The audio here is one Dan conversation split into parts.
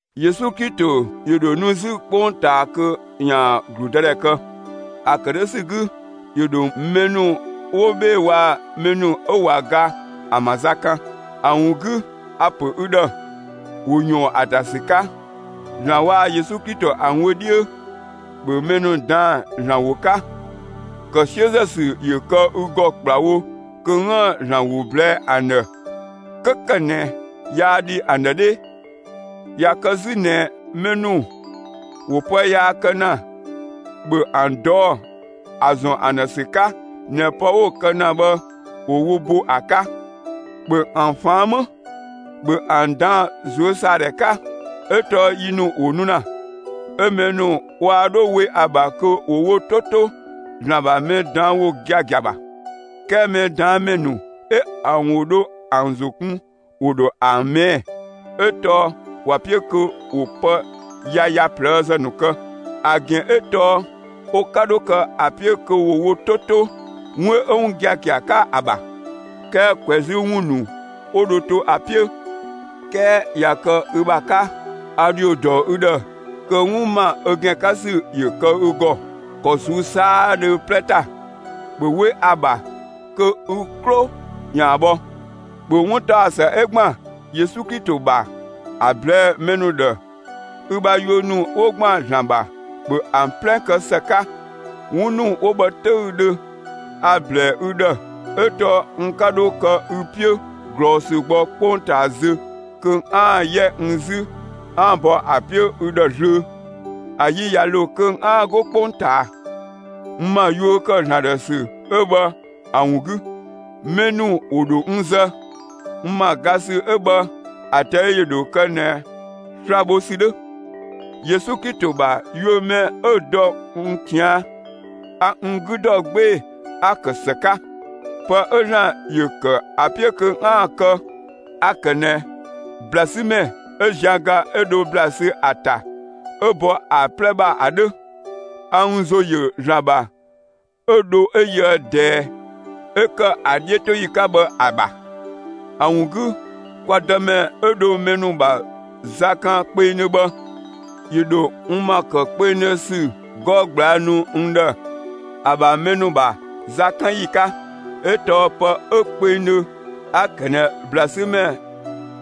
Yesu Klito ‑yö ‑dho nu 'zü 'kpongtaa kö ‑yaan ‑gludëdhɛ kë. ‑A ‑kë 'dhö ‑sü 'gü ‑yö ‑dho mɛ ‑nu 'wo 'bhee‑ waa‑ mɛ ‑nu 'ö ꞊wa ga ‑an ‑bha za kan. ‑A ‑wun 'gü, a‑ ‑pö ü ‑dhë ‑wo ꞊yɔɔn ‑a ‑ta ‑sü 'ka, ‑Zlan waa‑ Yesu Klito ‑an wö 'dhiö: ‑Bhö mɛ ‑nu ꞊daan'‑ ‑Zlan ‑wo 'ka! ‑Kë 'siözë ‑sü ‑yö kë ü ‑gɔ ‑kplawo kö 'üën‑ ‑Zlan ‑wo ꞊blɛɛ'‑ ‑an ‑dhë 'kö ‑kë ꞊nɛ yaa dhi ‑an ‑dhë 'dhee. ꞊Ya kë 'zü ꞊nɛ mɛ ‑nu ‑wo pë yaa kë ‑na, ‑bhö ‑an ꞊dɔɔ' ‑a ‑zɔn ‑an ‑dhë ‑sü 'ka ꞊nɛ pë 'wo‑ kë ‑na bhë, ‑wo wo bo ‑a 'ka. ‑Bhö ‑an ꞊faan' 'më! ‑Bhö ‑an ꞊daan'‑ ꞊zuösaadhɛ 'ka! 'Ö tɔɔ yi ‑nu ‑wo nu ‑na, 'ö mɛ ‑nu waa 'dho we ‑a ‑bha kö ‑wo wo 'to 'to ‑Zlan ‑bha mɛ ꞊daan' ‑wo giagia ‑bha. 'Kɛɛ mɛ ꞊daan' ‑mɛ ‑nu 'ö ‑an ‑wo dho ‑an ‑zo kun 'wo dho ‑an ꞊mɛɛ'‑. 'Ö tɔɔ ‑wa 'piö kö ‑wo pë yaya ꞊plëëzë ‑nu kë. ‑A ‑gɛn 'ö tɔɔ wo 'ka 'dho kë ‑a 'piö kö 'wo wo 'to 'to, 'wun 'ö 'wun giagia 'ka ‑a ‑bha, 'kɛɛ ꞊kwɛzü ‑wun ‑nu 'wo dho to ‑a 'piö. 'Kɛɛ ꞊ya kë ü ‑bha 'ka, a ‑dhio ‑dɔ ü ‑dhë kö 'wun ‑ma ö ‑gɛn 'ka ‑sü ‑yö kë ü ‑gɔ, ‑kɔ ꞊suu'‑ 'saadhö 'plɛ ‑ta! ‑Bhö 'we ‑a ‑bha kö ü 'klo ‑yaan bhɔ! ‑Bhö 'wuntaɔsë 'ö ‑gban Yesu Klito ‑bha, ‑a ꞊blɛɛ'‑ mɛ ‑nu ‑dhë! Ü ‑bha yuö ‑nu 'wo ‑gban ‑Zlan ‑bha, ‑bhö ‑an 'plɛ kë ‑së 'ka! ('Wun ‑nu 'wo bhë 'töüdhö a‑ ‑blɛɛ ü ‑dhë, 'ö tɔɔ n 'ka 'dhö kë ü 'piö ꞊glɔɔsü gbɔ 'kpongtaa zö kö 'aan‑ 'yɛ n 'zü 'aan‑ bɔ ‑a 'piö ü ‑dhë zlöö.) ‑A yi ꞊ya ‑lo kö 'aan‑ 'go 'kpongtaa. N ‑ma yuö ‑kë ‑Zlan ‑dhë ‑sü 'ö bhë ‑a ‑wun 'gü, mɛ ‑nu ‑wo ‑dho n zë. N ‑ma ga ‑sü 'ö bhë, ‑a ꞊tɛi' ‑yö ‑dho kë ꞊nɛ sla‑ bho ‑sü 'dhö. Yesu Klito ‑bha yuö mɛ 'ö dɔ n ꞊tian', a n 'gü dɔ 'gbee‑ 'a‑ ‑kë ‑së 'ka. Pë 'ö ‑Zlan ‑yö ‑kë ‑a 'piö kö 'aan‑ kë, a‑ ‑kë ꞊nɛ ‑bla 'sü ‑mɛ 'ö zian ga 'ö dho ‑bla sü ‑a ‑ta, 'ö bɔ ‑a 'plɛ ‑bha ‑a 'dhö. A n ‑zo ‑yö ‑Zlan ‑bha 'ö dho 'ö yöë ꞊dɛɛ 'ö ‑kë ‑a 'dhiötoyi 'ka bhë ‑a ‑bha. ‑A ‑wun 'gü kwa Dëmɛ 'ö dho mɛ ‑nu ‑bha za kan kpengdhö bhë, ‑yö ‑dho n ‑ma ‑kë kpengdhö ‑sü 'gɔ ꞊gblaa' nu n ‑dhë, ‑a ‑bha mɛ ‑nu ‑bha zakanyi 'ka ('ö tɔɔ pë 'ö kpengdhö 'a‑ ‑kë ꞊nɛ ‑bla 'sü ‑mɛ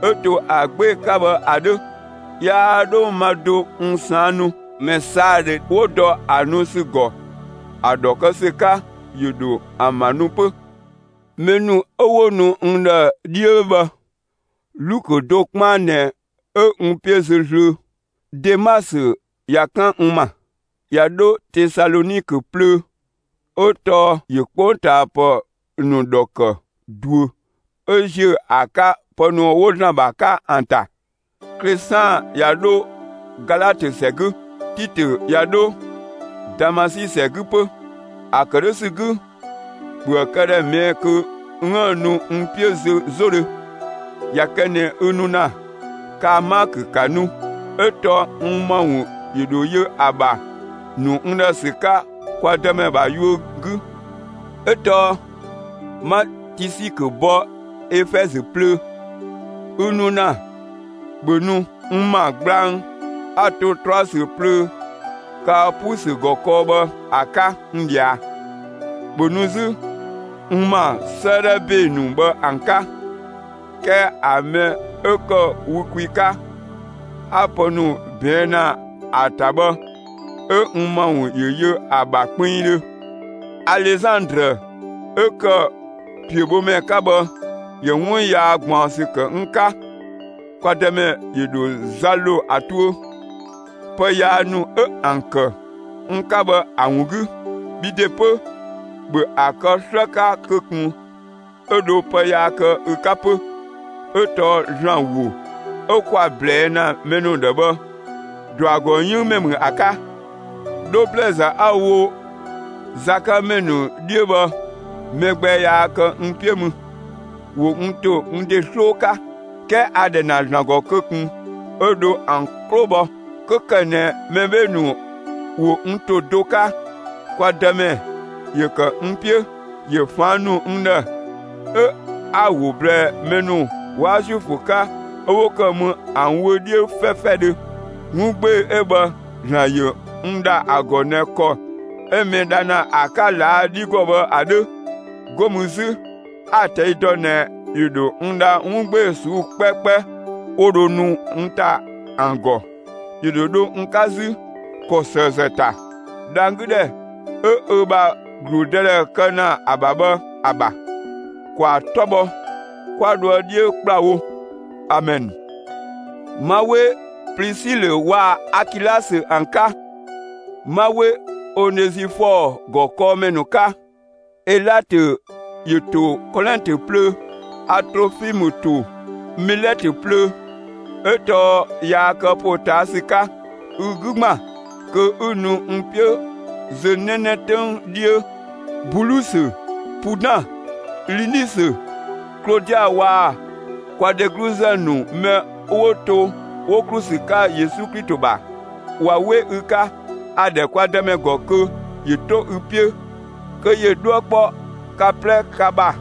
'ö 'to ‑a 'gbee‑ 'ka bhë ‑a 'dhö). Yaa 'dho ma do n ꞊saan' nu; mɛ 'saadhö 'wo dɔ ‑a nu ‑sü ‑gɔ, ‑a ‑dhɔ kë ‑sü 'ka, ‑yö ‑dho ‑an ‑bha nu 'pö. Mɛ ‑nu 'ö 'wo nu n ‑dhë 'dhiö bhë, Lukö do 'kpaan ꞊nɛ 'ö n 'piö zö zlöö. Demasö ꞊ya 'kan n ‑ma, ꞊ya 'dho Tesalɔnikö plöö; 'ö tɔɔ ‑yö 'kpongtaapë ‑nu ‑dhɔ ‑kë ꞊duö ('ö ‑ziö ‑a 'ka pë ‑nu 'wo ‑Zlan ‑bha 'ka ‑an ‑ta). Klesaan ꞊ya 'dho Galatö ‑sɛ 'gü; Titö ꞊ya 'dho Damasi ‑sɛ 'gü 'pö. ‑A ‑kë 'dhö ‑sü 'gü, ‑bhöë këdhɛ ꞊mɛɛ'‑ kö 'üën‑ nu n 'piö zö 'zodhö. ꞊Ya kë ꞊nɛ ü nu ‑na, kaa‑ Maakö ‑ka nu! 'Ö tɔɔ n ‑ma ‑wun ‑yö ‑dho yö ‑a ‑bha nu n ‑dhë ‑sü 'ka kwa Dëmɛ ‑bha yuö 'gü. 'Ö tɔɔ 'ma Tisikö bɔ Efɛzö plöö. Ü nu ‑na, ‑bhö nu n ‑ma gblang 'a‑ to Troasö plöö Kaapusö ‑gɔ kɔɔ bhë ‑a 'ka n ꞊dhia! ‑Bhö nu 'zü n ‑ma 'sëëdhɛ ‑be ‑nu bhë ‑an 'ka. 'Kɛɛ ‑a mɛ 'ö ‑kë wü kwi 'ka, 'a pë ‑nu ꞊bɛɛn' ‑na ‑a ‑ta bhë, 'ö n ‑ma ‑wun ‑yö yö ‑a ‑bha kpinngdhö. Alezandrë 'ö ‑kë ‑piöbhomɛ 'ka bhë, ‑yö 'wun yaa ꞊gbaɔnsü ‑kë n 'ka. Kwa Dëmɛ ‑yö ‑dho za ‑lo ‑a tuö, pë yaa ‑nu 'ö ‑an ‑kë n 'ka bhë ‑a ‑wun 'gü. Bhi ‑de 'pö, ‑bhö ‑a kë 'slë 'ka kö ꞊kun 'ö dho pë yaa kë ü 'ka 'pö! 'Ö tɔɔ ‑Zlan ‑wo 'ö 'kwa‑ ꞊blɛɛ' ‑na mɛ ‑nu ‑dhë bhë, ‑dɔ ‑a ‑gɔ 'yënng ‑mɛ ‑mü ‑a 'ka. 'Dho ‑blɛɛzë 'a‑ wo zakanmɛ ‑nu 'dhiö bhë, mɛ gbɛ yaa kë n 'piö mü. ‑Wo n ‑to n ‑de 'sloo 'ka. 'Kɛɛ a‑ ‑dhɛ ‑na ‑Zlan ‑gɔ kö ꞊kun 'ö dho ‑an 'klo bhɔ. ('Kö ‑kë ꞊nɛ mɛ 'bhee‑ ‑nu ‑wo n ‑to do 'ka,) kwa Dëmɛ ‑yö ‑kë n 'piö; ‑yö ꞊faan' ‑nu n ‑dhë, 'ö 'a‑ ‑wo ꞊blɛɛ mɛ ‑nu 'waa Zuifö 'ka 'ö 'wo ‑kë mü ‑an wö 'dhiö 'fɛfɛdhö. 'Wun 'gbee‑ 'ö bhë ‑Zlan ‑yö n ‑dha ‑a ‑gɔ ꞊nɛ ‑kɔ 'ö mɛ dha ‑na ‑a 'ka ꞊laa' 'dhi ‑gɔ bhë ‑a 'dhö. 'Go mü 'zü a‑ ꞊tɛi' dɔ ꞊nɛ, ‑yö ‑dho n dha 'wun 'gbee‑ ꞊suu'‑ 'kpɛkpɛ 'wo dho nu n ‑ta ‑an ‑gɔ. ‑Yö ‑dho dho n 'ka 'zü, ‑kɔ ‑sëëzë ‑ta, dhang‑ 'gü ‑dhɛ 'ö ö ‑bha ‑gludëdhɛ kë ‑na ‑a ‑bha bhë ‑a ‑bha. ‑Kwaa 'tɔ bhɔ, 'kwa dhoë 'dhiö ‑kplawo! Amɛn. 'Ma 'we Plisilö waa‑ Akilasö ‑an 'ka! 'Ma 'we Onezifɔɔ ‑gɔ 'kɔɔmɛ ‑nu 'ka! Elatö ‑yö ‑to Kolɛntö plöö. A Trofimë ‑to Milɛtö plöö, 'ö tɔɔ yaa kë ‑potaasü 'ka. Ü 'gü ‑gban kö 'ü nu n 'piö zö 'nɛnɛ 'töng 'dhiö! Bulusö, Pudan, Linisö, Klodia waa‑ kwa dhegluzë ‑nu mɛ 'wo to 'wo ‑klu ‑sü 'ka Yesu Klito ‑bha, ꞊wa 'we ü 'ka! A‑ ‑dhɛ kwa Dëmɛ ‑gɔ kö ‑yö 'to ü 'piö, kö ‑yö 'dhuë‑ 'kpɔ ka 'plɛ ka ‑bha!